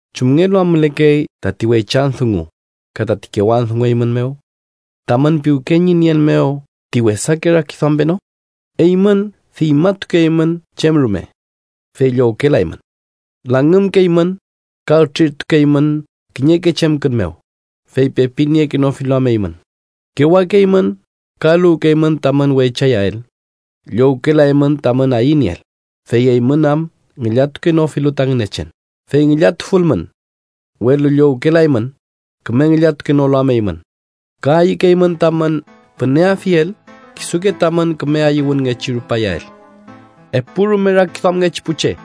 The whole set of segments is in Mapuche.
¿Chumngelu am mülekey tati weychan dungu ka tati kewan dungu eymün mew? ¿Tamün piwke ñi nien mew ti wesake rakiduam peno? Eymün diñmatukeymün chem rume, fey llowkelaymün. Langümkeymün, ka ütrirtukeymün kiñeke chemkün mew, fey pepi niekenofilu am eymün, kewakeymün ka eluwkeymün tamün weychayael. Llowkelaymün tamün ayünieel, fey eymün am ngillatukenofilu ta Ngünechen. Fey ngillatufulmün, welu llowkelaymün, küme ngillatukenolu am eymün, ka ayükeymün tamün püneafiel kisuke tamün küme ayüwünngechi rupayael. ¡Epurume rakiduamngechi pu che!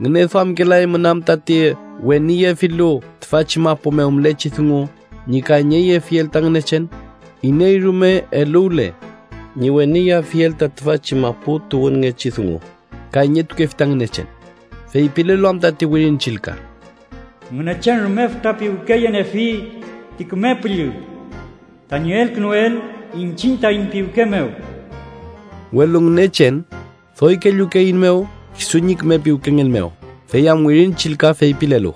¿Ngüneduamkelaymün am tati weniyefilu tüfachi mapu mew mülechi dungu ñi kayñeyefiel ta Ngünechen? Iney rume eluwle ñi weniyeafiel ta tüfachi mapu tuwünngechi dungu, kayñetukefi ta Ngünechen, feypilelu am tati Wirin Chillka: “Ngünechen rume fütra piwkeyeniefi ti Küme Püllü tañi elkünuel iñchiñ taiñ piwke mew.” Welu Ngünechen doy kellukeeiñmew kisu ñi küme piwkengen mew, fey am Wirin Chillka feypilelu: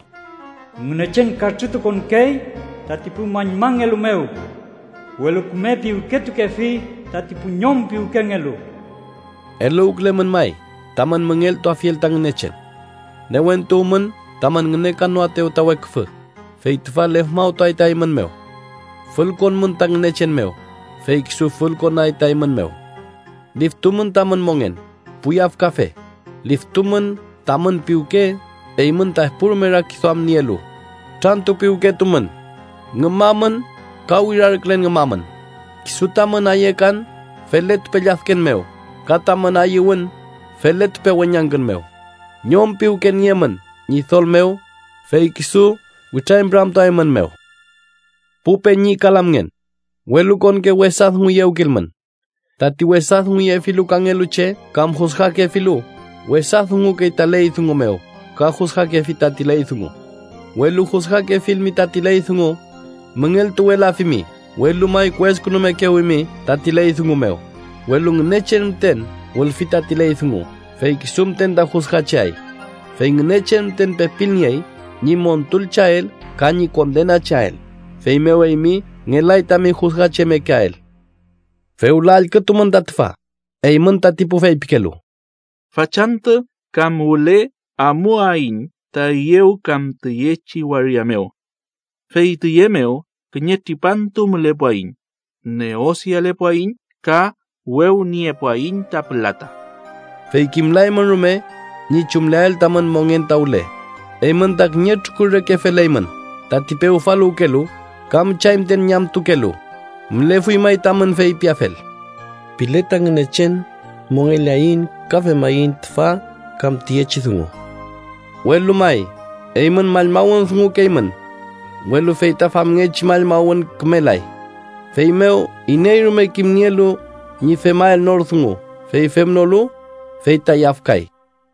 “Ngünechen katrütukonkey tati pu mallmangelu mew, welu küme piwketukefi tati pu ñom piwkengelu.” Eluwkülemün may tamün müngeltuafiel ta Ngünechen. Newentuwmün tamün ngünekanoaetew ta weküfü, fey tüfa lefmawtuay ta eymün mew. Fülkonmün ta Ngünechen mew, fey kisu fülkonay ta eymün mew. ¡Liftumün tamün mongen, pu yafkafe! ¡Liftumün tamün piwke eymün ta epurume rakiduam nielu! ¡Kutrantupiwketumün, ngümamün ka wirarkülen ngümamün! ¡Kisu tamün ayekan feletupe lladken mew ka tamün ayüwün feletupe weñangkün mew! Ñom piwke niemün Ñidol mew, fey kisu witrañpüramtuaeymünmew. Pu peñi ka lamngen, welukonke wesa dunguyewkilmün. Tati wesa dunguyefilu kangelu che kam jusgakefilu, wesa dungukey ta ley dungu mew ka jusgakefi tati ley dungu. Welu jusgakefilmi tati ley dungu, müngeltuwelafimi, welu may kueskünumekewimi tati ley dungu mew. Welu Ngünechen müten wülfi tati ley dungu, fey kisu müten ta jusgacheay. Fey Ngünechen müten pepilniey ñi montulcheael ka ñi kondenacheael. Feymew eymi ngelay tami jusgachemekeael. Fewla allkümün ta tüfa, eymün tati pu feypikelu: “Fachantü kam wüle amuaiñ ta üyew kam tüyechi waria mew. Fey tüye mew kiñe tripantu mülepuaiñ, neosialepuaiñ ka wewniepuaiñ ta pülata.” ¡Fey kimlaymün rume ñi chumleael tamün mongen ta wüle! Eymün ta kiñe trukur reke feleymün tati pewfaluwkelu, ka müchay müten ñamtukelu. Mülefuy may tamün feypiafel: “Pile ta Ngünechen, mongeleaiñ ka femaiñ tüfa kam tüyechi dungu.” Welu may, eymün mallmawün dungukeymün, welu fey ta famngechi mallmawün kümelay. Feymew, iney rume kimnielu ñi femael nor dungu, fey femnolu, fey ta yafkay.